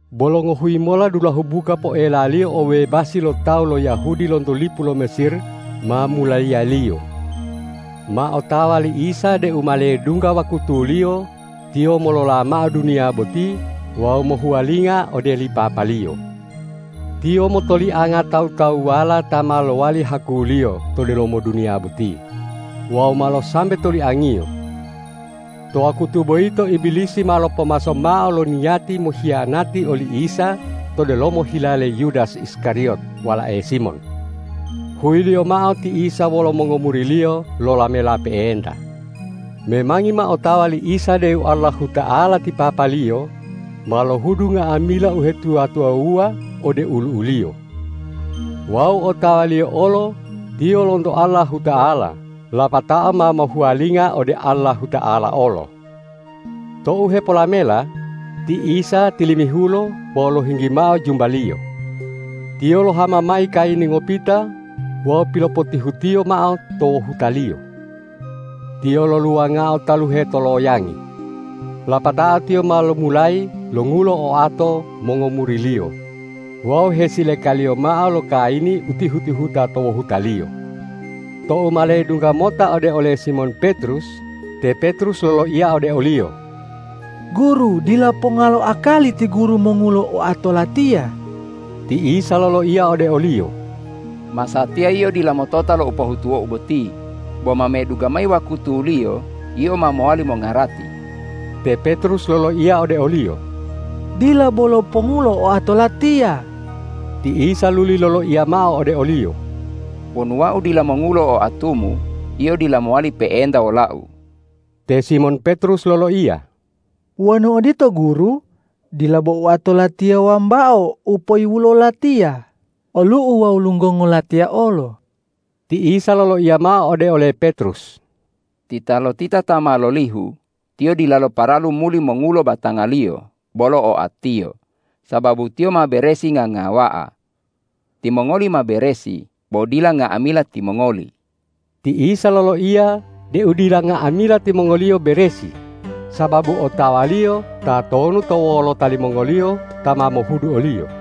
Bolo ngohuyi mola dulahu buka poelaliyo obebasi lo tawu lo Yahudi lonto lipu lo Mesir ma mulayiyaliyo. Ma otawa li Isa deu ma ledungga wakutuliyo Tiyo molola mao duniya boti wawu mohuwalinga ode li Papa-Liyo. Tiyo motolianga tawu-tawuwala ta ma lowali haku-Liyo to delomo duniya boti wawu malo sambe toliang-Iyo. To wakutu boyito Ibilisi ma lopomaso mao lo niyati mohiyanati oli Isa to delomo hila le Yudas Iskariyot walae Simon. Huyiliyo mao ti Isa wolo mongomuri-Liyo lolamela pe'enta. Memangi ma otawa li Isa deu Allahuta'ala ti Papa-Liyo ma lohudu nga'amila uhetuwa-tuwawuwa ode olu'u-Liyo. Wawu otawa-Liyo olo Tiyo lonto Allahuta'ala lapatao ma mohuwalinga ode Allahuta'ala olo. Tou hepolamela, ti Isa tilimihulo wawu lohinggi mao jumba-Liyo. Tiyo lohama mayi kayini ngopita wawu pilopotihutiyo mao to wohuta-Liyo. Tiyo loluwangao taluhe to loyangi. Lapatao Tiyo ma lomulayi longulo oato mongomuri-Liyo wawu hesilekaliyo mao lo kayini u tihu-tihuta to wohuta-Liyo. Tou ma ledungga mota ode ole Simon Petrus, te Petrus loloiya ode o-Liyo,”Guru, dila ponga lo akali ti Guru mongulo oato latiya.” Ti Isa loloiya ode oliyo,”Masatiya yio dila motota lo u pohutuwo-U boti, bo ma medungga mayi wakutuliyo yio ma mowali mongarati.” Te Petrus loloiya ode o-Liyo,”Dila bolo pongulo oato latiya!” Ti Isa luli loloiya mao ode oliyo,”Wonu Wau dila mongulo oatumu, yio dila mowali pe'enta wola-U.” Te Simon Petrus loloiya,”Wonu odito Guru, dila bo oato latiya wambao u poiwulo latiya, olu'u wawu lunggongo latiya olo!” Ti Isa loloiya mao ode ole Petrus”Titalotita ta ma lolihu, tiyo dilalo paralu muli mongulo batangaliyo bolo oatiyo, sababu tiyo ma beresi ngangawa'a. Timongoli ma beresi, bo dila nga'amila timongoli.” Ti Isa loloiya deu dila nga'amila timongoliyo beresi sababu otawa-Liyo tatonu to wolota limongoliyo ta ma mohudu o-Liyo.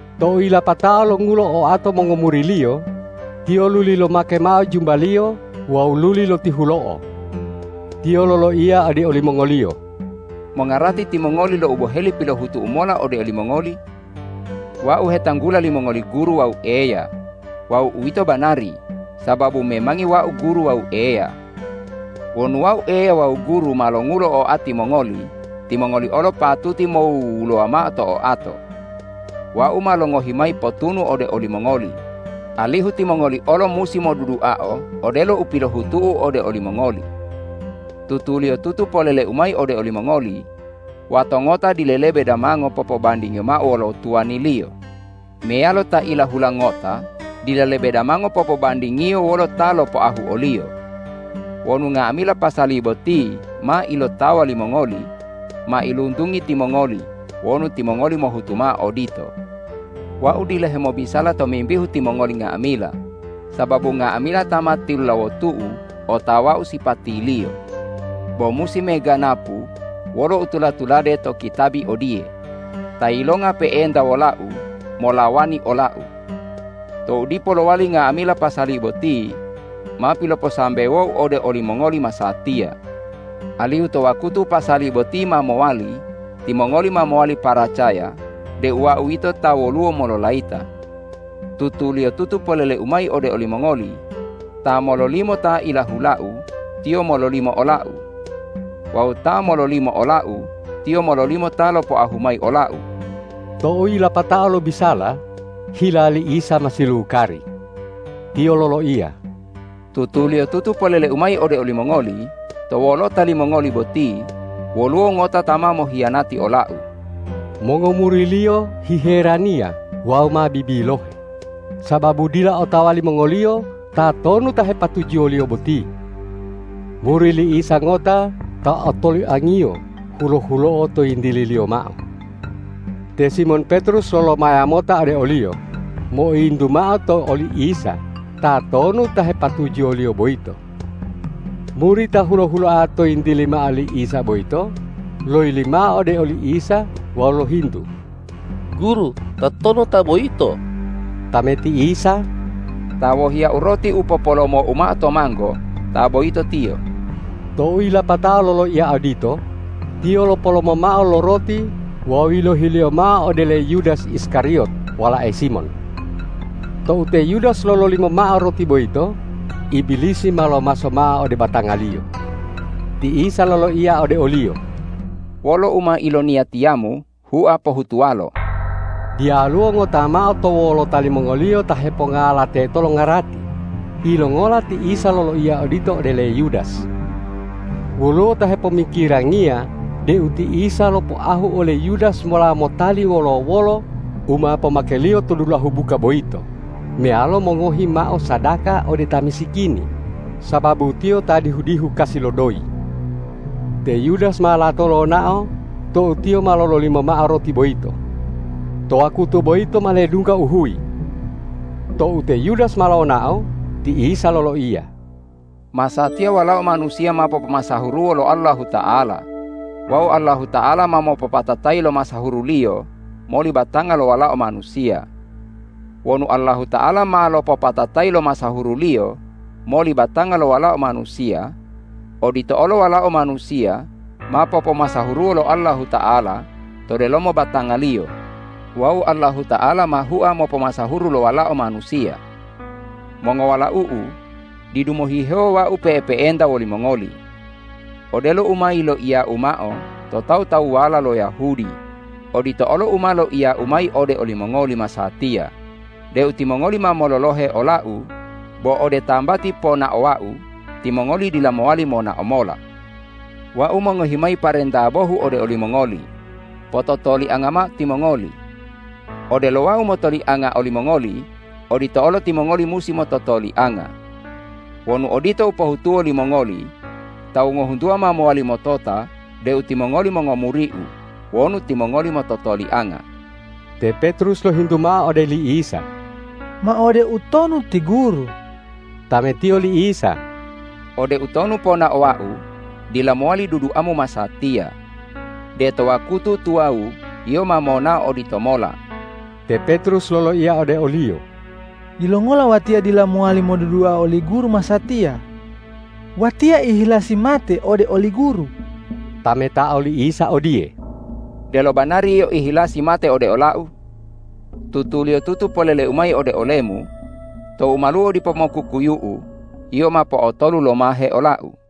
Tou yilapatao longulo oato mongomuri-Liyo, Tiyo luli lomake mao jumba-Liyo wawu luli lotihulo'o. Tiyo loloiya ode olimongoliyo,”Mongarati timongoli lo u boheli pilohutu-U mola ode olimongoli? Wau hetanggula limongoli Guru wawu Eya. Wawu uwito banari, sababu memangi Wau Guru wawu Eya. Wonu Wau Eya wawu Guru, ma longulo oati mongoli, timongoli olo patuti mowuwulowa mao to oato. Wau ma longohi mayi potunu ode olimongoli, alihu timongoli olo musi moduduao odelo u pilohutu-U ode olimongoli. Tutuliyotutu polele-U mayi ode olimongoli: Wato ngota dila lebe damango popobandingiyo mao wolo tuwaniliyo, meyalo ta ilahula ngota dila lebe damango popobandingiyo wolo ta lopoahu oliyo. Wonu nga'amila pasali boti ma ilotawa limongoli, mailuntungi timongoli wonu timongoli mohutu mao odito. Wau dila hemobisala tomimbihu timongoli nga'amila, sababu nga'amila ta ma tilulawotu-U otawa-U sipatiliyo. Bo musi meganapu wolo u tula-tulade to kitabi odiye, ’Ta yilonga pe'enta wola-U molawani ola-U.’ Tou dipo lowali nga'amila pasali boti, ma piloposambewo-U ode olimongoli masatiya, alihu to wakutu pasali boti ma mowali, timongoli ma mowali paracaya deu Wau yito Ta woluwo mololayita. Tutuliyotutu polele-U mayi ode olimongoli: Ta mololimo ta ilahula-U, tiyo mololimo ola-U. Wawu ta mololimo ola-U, tiyo mololimo Ta lopoahu mayi ola-U.” Tou yilapatao lobisala, hila li Isa ma silukari. Tiyo loloiya,”Tutuliyotutu polele-U mayi ode olimongoli: To wolota limongoli boti, woluwo ngota ta ma mohiyanati ola-U.” Mongomuri-Liyo hiheraniya wawu ma bibilohe, sababu dila otawa limongoliyo tatonu ta hepatujuwo-Liyo boti. Muri li Isa ngota ta otoliang-Iyo hulo-huloa to yintili-Liyo mao. Te Simon Petrus lolomaya mota ode oliyo, moiyintu mao to oli Isa tatonu ta hepatujuwo-Liyo boyito. Muri ta hulo-huloa to yintili mao li Isa boyito loyili mao ode oli Isa wawu lohintu,”Guru, tatonu ta boyito?” Tameti Isa,”Ta wohiya-U roti u popolomo-U mao to manggo, ta boyito tiyo.” Tou yilapatao loloiya odito, Tiyo lopolomo mao lo roti wawu yilohiliyo mao ode le Yudas Iskariyot walae Simon. Tou te Yudas lololimo mao roti boyito, Ibilisi ma lomaso mao ode batangaliyo. Ti Isa loloiya ode oliyo,”Wolo u ma iloniyatiyamu hua pohutuwalo.” Diyaluwo ngota mao to wolota limongoliyo ta hepongala teto longarati, yilongola ti Isa loloiya odito ode le Yudas. Woluwo ta hepomikirangiya deu ti Isa lopoahu ole Yudas mola motali wolo-wolo u ma pomakeliyo to dulahu buka boyito meyalo mongohi mao sadaka ode ta misikini, sababu tiyo ta dihu-dihu kasi lo doyi. Te Yudas ma lato lonao tou tiyo ma lololimo mao roti boyito. To wakutu boyito ma ledungga uhuyi. Tou te Yudas ma lonao, ti Isa loloiya,”Masatiya Walao Manusiya ma popomasahuruwo lo Allahuta'ala wawu Allahuta'ala ma mopopatatayi lo masahuru-Liyo moli batanga lo Walao Manusiya. Wonu Allahuta'ala ma lopopatatayi lo masahuru-Liyo moli batanga lo Walao Manusiya, odito olo Walao Manusiya ma popomasahuruwo lo Allahuta'ala to delomo batanga-Liyo wawu Allahuta'ala ma hua mopomasahuru lo Walao Manusiya. Mongowalau-U, didu mohihewo Wau pe'epe'enta wolimongoli. Odelo u ma yiloiya-U mao to tawu-tawuwala lo Yahudi, odito olo u ma loiya-U mayi ode olimongoli masatiya deu timongoli ma mololohe ola-U, bo ode tambati ponao Wau timongoli dila mowali monao mola. Wau mongohi mayi parenta bohu ode olimongoli: Pototolianga mao timongoli. Odelo Wau motolianga olimongoli, odito olo timongoli musi mototolianga. Wonu odito u pohutuwo limongoli, tawu ngohuntuwa ma mowali motota deu timongoli mongomuri-U wonu timongoli mototolianga.” Te Petrus lohintu mao ode li Isa,”Ma ode utonu ti Guru?” Tametiyo li Isa,”Ode utonu ponaowa-U, dila mowali duduamu masatiya. De to wakutu tuwawu yio ma monao oditomola.” Te Petrus loloiya ode o-Liyo,”Yilongola watiya dila mowali modudua oli Guru masatiya? Watiya ihilasi mate ode oli Guru!” Tametao li Isa odiye,”Delo banari yio ihilasi mate ode ola-U? Tutuliyotutu polele-U mayi ode olemu: Tou maluo dipo mokukuyu'u, yio ma po'otolu lomahe ola-U.”